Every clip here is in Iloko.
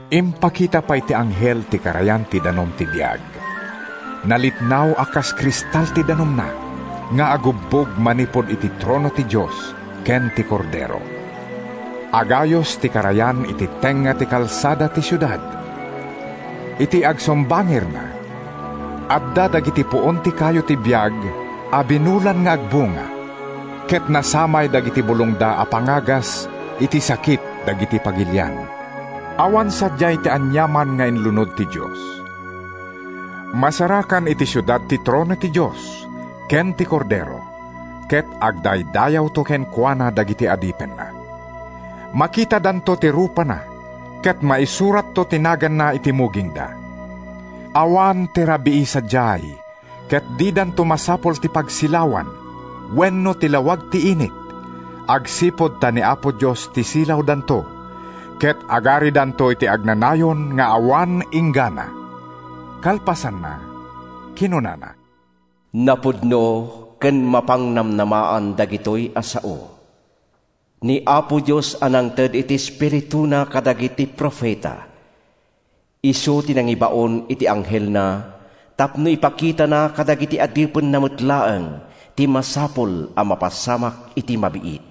Impakita pay ti anghel ti karayan ti danum ti biag. Nalitnaw a kas kristal ti danumna nga agubbog manipud iti trono ti Dios ken ti Kordero. Agayus ti karayan iti tengnga ti kalsada ti siudad. Iti agsumbangirna, adda dagiti puon ti kayo ti biag a binulan nga agbunga, ket nasamay dagiti bulongda a pangagas iti sakit dagiti pagilian. Awan sadiay ti aniaman nga inlunod ti Dios. Masarakan iti siudad ti trono ti Dios ken ti Kordero ket agdaydayawto kenkuana dagiti adipenna. Makitadanto ti rupana ket maisuratto ti naganna iti mugingda. Awan ti rabii sadiay ket didanto masapul ti pagsilawan wenno ti lawag ti init agsipud ta ni Apo Dios ti silawdanto ket agaridanto iti agnanayon nga awan inggana. Kalpasanna, kinunana, “Napudno ken mapangnamnamaan dagitoy a sao. Ni Apo Dios a nangted iti Espirituna kadagiti profeta, isu ti nangibaon iti anghelna tapno ipakitana kadagiti adipenna met laeng ti masapul a mapasamak iti mabiit.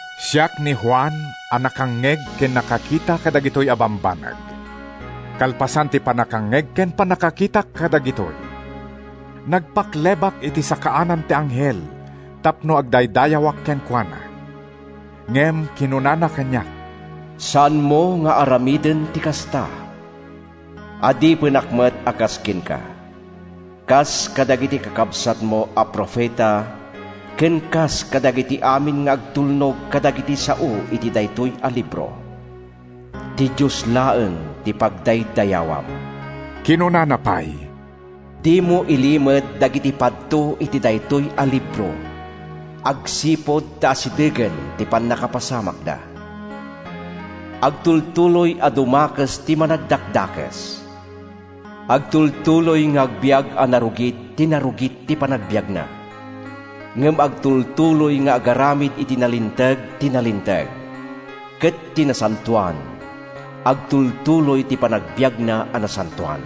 Siak ni Juan a nakangngeg ken nakakita kadagitoy a bambanag. Kalpasan ti pannakangngeg ken pannakakitak kadagitoy, nagpaklebak iti sakaanan ti anghel tapno agdaydayawak kenkuana. Ngem kinunana kaniak: “Saanmo nga aramiden ti kasta! Adipenak met a kas kenka, kas kadagiti kakabsatmo a profeta ken kas kadagiti amin nga agtulnog kadagiti sao iti daytoy a libro. Ti Dios laeng ti pagdaydayawam!” Kinunana pay: “Dimo ilimed dagiti padto iti daytoy a libro agsipud ta asidegen ti pannakapasamakda. Agtultuloy a dumakes ti managdakdakes. Agtultuloy nga agbiag a narugit ti narugit ti panagbiagna, ngem agtultuloy nga agaramid iti nalinteg ti nalinteg, ket ti nasantoan, agtultuloy ti panagbiagna a nasantoan.”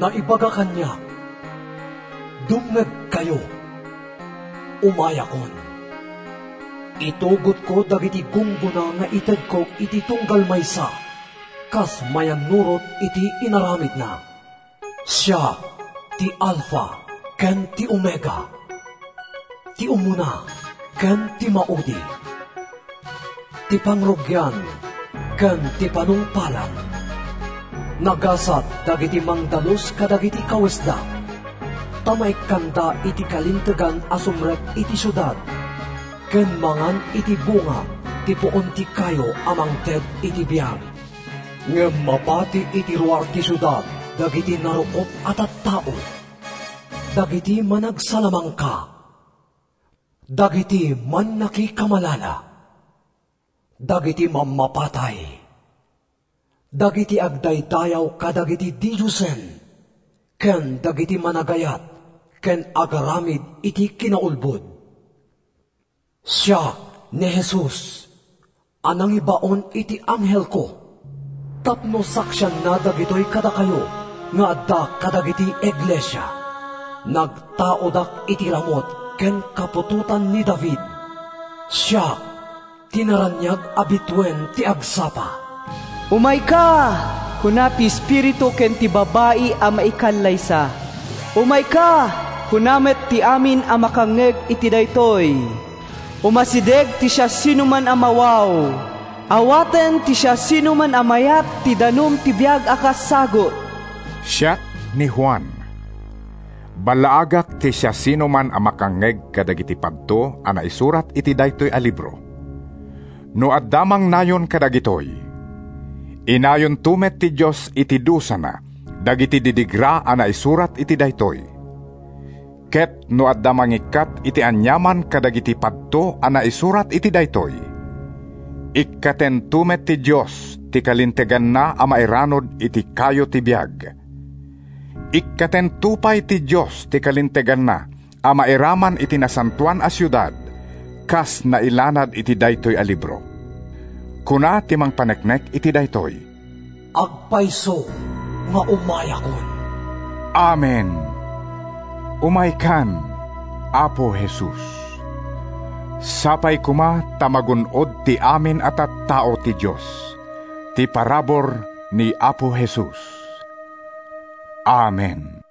Naibaga kaniak: “Dumngegkayo, umayakon! Itugotko dagiti gunggona nga itedko iti tunggal maysa kas mayannurot iti inaramidna. Siak ti Alfa ken ti Omega, ti umuna ken ti maudi, ti pangrugian ken ti panungpalan.” Nagasat dagiti mangdalus kadagiti kawesda ta maikkanda iti kalintegan a sumrek iti siudad ken mangan iti bunga ti puon ti kayo a mangted iti biag. Ngem mabati iti ruar ti siudad dagiti narukop a tattao, dagiti managsalamangka, dagiti mannakikamalala, dagiti mammapatay, dagiti agdaydayaw kadagiti didiosen ken dagiti managayat ken agaramid iti kinaulbod. “Siak ni Jesus a nangibaon iti anghelko tapno saksianna dagitoy kadakayo nga adda kadagiti iglesia. Nagtaudak iti ramut ken kaputotan ni David. Siak ti naraniag a bituen ti agsapa.” “Umayka!” kuna ti Espiritu ken ti Babai a Maikallaysa. “Umayka!” kuna met ti amin a makangngeg iti daytoy. Umasideg ti siasinoman a mawaw. Awaten ti siasinoman a mayat ti danum ti biag a kas sagut. Siak ni Juan. Ballaagak ti siasinoman a makangngeg kadagiti padto a naisurat iti daytoy a libro: No adda mangnayon kadagitoy, inayonto met ti Dios iti dusana dagiti didigra a naisurat iti daytoy. Ket no adda mangikkat iti aniaman kadagiti padto a naisurat iti daytoy, ikkatento met ti Dios ti kalinteganna a mairanud iti kayo ti biag. Ikkatento pay ti Dios ti kalinteganna a mairaman iti Nasantoan a Siudad kas nailanad iti daytoy a libro. Kuna ti mangpaneknek iti daytoy, “Agpayso nga umayakon!” Amen! Umaykan, Apo Jesus! Sapay koma ta magun-od ti amin a tattao ti Dios ti parabur ni Apo Jesus. Amen.